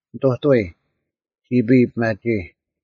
ᓂᑐᑐᐎ; ᒋᐱᔾ ᐱᒪᒋᐃ: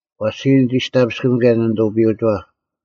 ᐛᔅ ᒋᔾ ᓂᒋᔅᑕᐱᔅᑯᒻ ᑭᔭ ᓂᓂᑐᐱᔪᐅᒋᐛᑉ;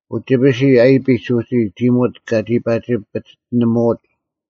ᐅᒋᐱᓯ ᐊᐃᐱᒡ ᐅᒋ ᒋᒧᑦ ᑲᒋ ᐸᒋ ᐱᔅᑎᓂᒧᐎᒡ: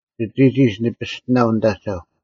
ᒋᑎᒋᒡ ᓂ ᐱᔅᑎᓇᐤ ᓂᑦ ᐊᒐᐧᒄ: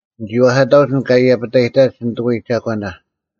ᓂᒋ ᐛᐧᑲᑕᐅᒡ ᐊᓐᒡ ᑲ ᐃᔭᐱᑕᔨᑕᒡ ᓂᑐᐎᔾ ᒐᒂᓇ: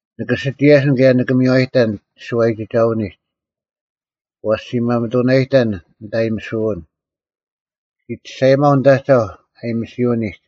ᓂᑭ ᓯᒋᔭᓯᓐ ᑭᔭ ᓂᑭ ᒥᔽᑕᓐ ᒋᓱᐛᔨᒋᒐᐅᓂᒡ: ᐛᔅ ᔅᒋ ᒪᒥᑐᓇᔨᑕᓐ ᓂᑦ ᐊᔨᒥᓱᐅᓐ; ᔅᒋ ᒋᔅᒐᔨᒪᐤ ᓂᑦ ᐊᒐᐧᒄ ᐊᔨᒥᓯᐅᓂᒡ;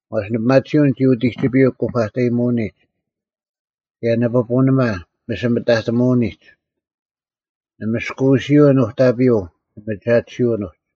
ᐛᔅ ᓂᐱᒪᑎᓯᐅᓐ ᒋ ᐅᑎᒋᐱᔪᐤ ᑯᐸᑕᔨᑎᒧᐅᓂᒡ, ᑭᔭ ᓂ ᐱᐳᓂᒪ ᒥᓯᒥᑕᑎᒧᐅᓂᒡ: ᓂ ᒥᔅᑯᐅᓯᐅᓐ ᓄᑕᐱᔪᐤ ᓂᒥᒐᑎᓯᐅᓐ ᐅᒡ,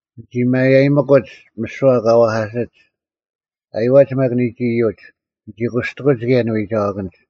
ᓂᒋ ᒪᒐᔨᒥᑯᒡ ᒥᓯᐛ ᑲ ᐛᐧᑲᓯᒡ, ᐊᔪᐛᒡ ᒪᒃ ᓂᒡ ᐃᔪᒡ, ᓂᒋ ᑯᔅᑎᑯᒡ ᑭᔭ ᓂᐎᒐᐛᑭᓐᒡ: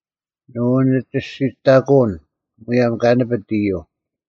ᓂ ᐅᓂᒋᔅᒋᑕᑯᐅᓐ, ᒧᔭᒻ ᑲ ᓂᐱᑦ ᐃᔪᐤ: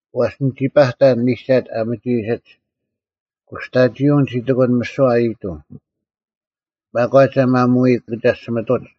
ᐛᔅ ᓂᒋ ᐸᑕᓐ ᒥᒐᑦ ᐊ ᒥᒋ ᐃᓯᒡ: ᑯᔅᑕᒋᐅᓐ ᒋ ᑎᑯᓐ ᒥᓯᐛ ᐊᔨᑐᐤ: ᒪᒂᒡ ᐊ ᒪᒧᐎ ᑭᒐᔅᒋᒥᑐᒡ,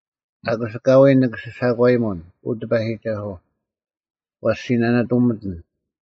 ᐊᑯᔅ ᐊᑲᐎᔾ ᓂᑭ ᓯᓴᒂᔨᒧᓐ, ᐅ ᑎᐸᔨᒋᒐᓱᐤ; ᐛᔅ ᔅᒋ ᓇᓇᑐᒥᑎᓐ: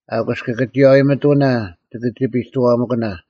ᐊᑯᔅ ᑭᑭᒋᔭᐎ ᒥᑐᓇ ᒋᑭ ᒋᐱᑐᐛᒥᑭᓇ;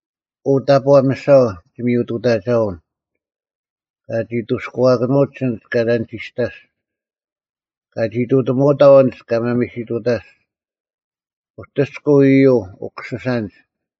ᐅ, ᑕᑈ ᒥᓴᐤ ᒋᒥᔪᑐᑕᒐᐅᓐ, ᑲᒋ ᐊᔅᑐᐛᑭᓄᒡ ᐊᓐᒡ ᑲ ᓇᓂᒋᔅᑕᔅᒡ; ᑲᒋ ᐃᑐᑎᒧᐅᑥᐤ ᐊᓐᒡ ᑲ ᒪᒥᓯᑐᑕᔅᒡ, ᐅᑎᔅᑯᐤ ᐃᔪᐤ ᐅᑯᓯᓴᓐᒡ!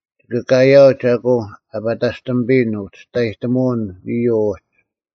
ᒋᑭ ᑲᔭᐅᒡ ᐊᑯ ᐊᐸᑕᔅᑎᒥᐱᔨᓐ ᐅᒋᔅᑕᔨᒧᐅᓐ ᐃᔪᐤ ᐅᒡ: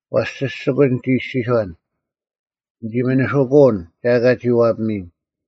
ᐛᔅ ᓯᔅᒋᑯᒡ ᓂᒋ ᐃᔅᒋᔄᓐ, “ᓂᒋ ᒥᓂᓱᑯᐅᓐ ᒐ ᐊᑲ ᒋ ᐛᐱᒥᔨᓐ᙮”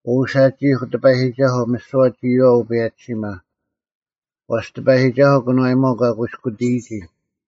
ᐅ ᓴᒋᐃᐧᒄ ᑎᐸᔨᒋᒐᓱᐤ, ᒥᓯᐛ ᒋᔨᐛᐤ ᐅᐸᔭᒋᓯᒪ: ᐛᔅ ᑎᐸᔨᒋᒐᓱᐤ ᑭᓄᐛᔨᒪᐤ ᑲ ᑯᐃᔅᑯᑎᔨᒋ,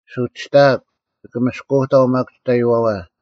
ᓱᒋᑕᐊᒄ, ᒋᑭ ᒥᔅᑯᐅᑕᐤ ᒪᒃ ᒋᑕᐃᐛᐛ,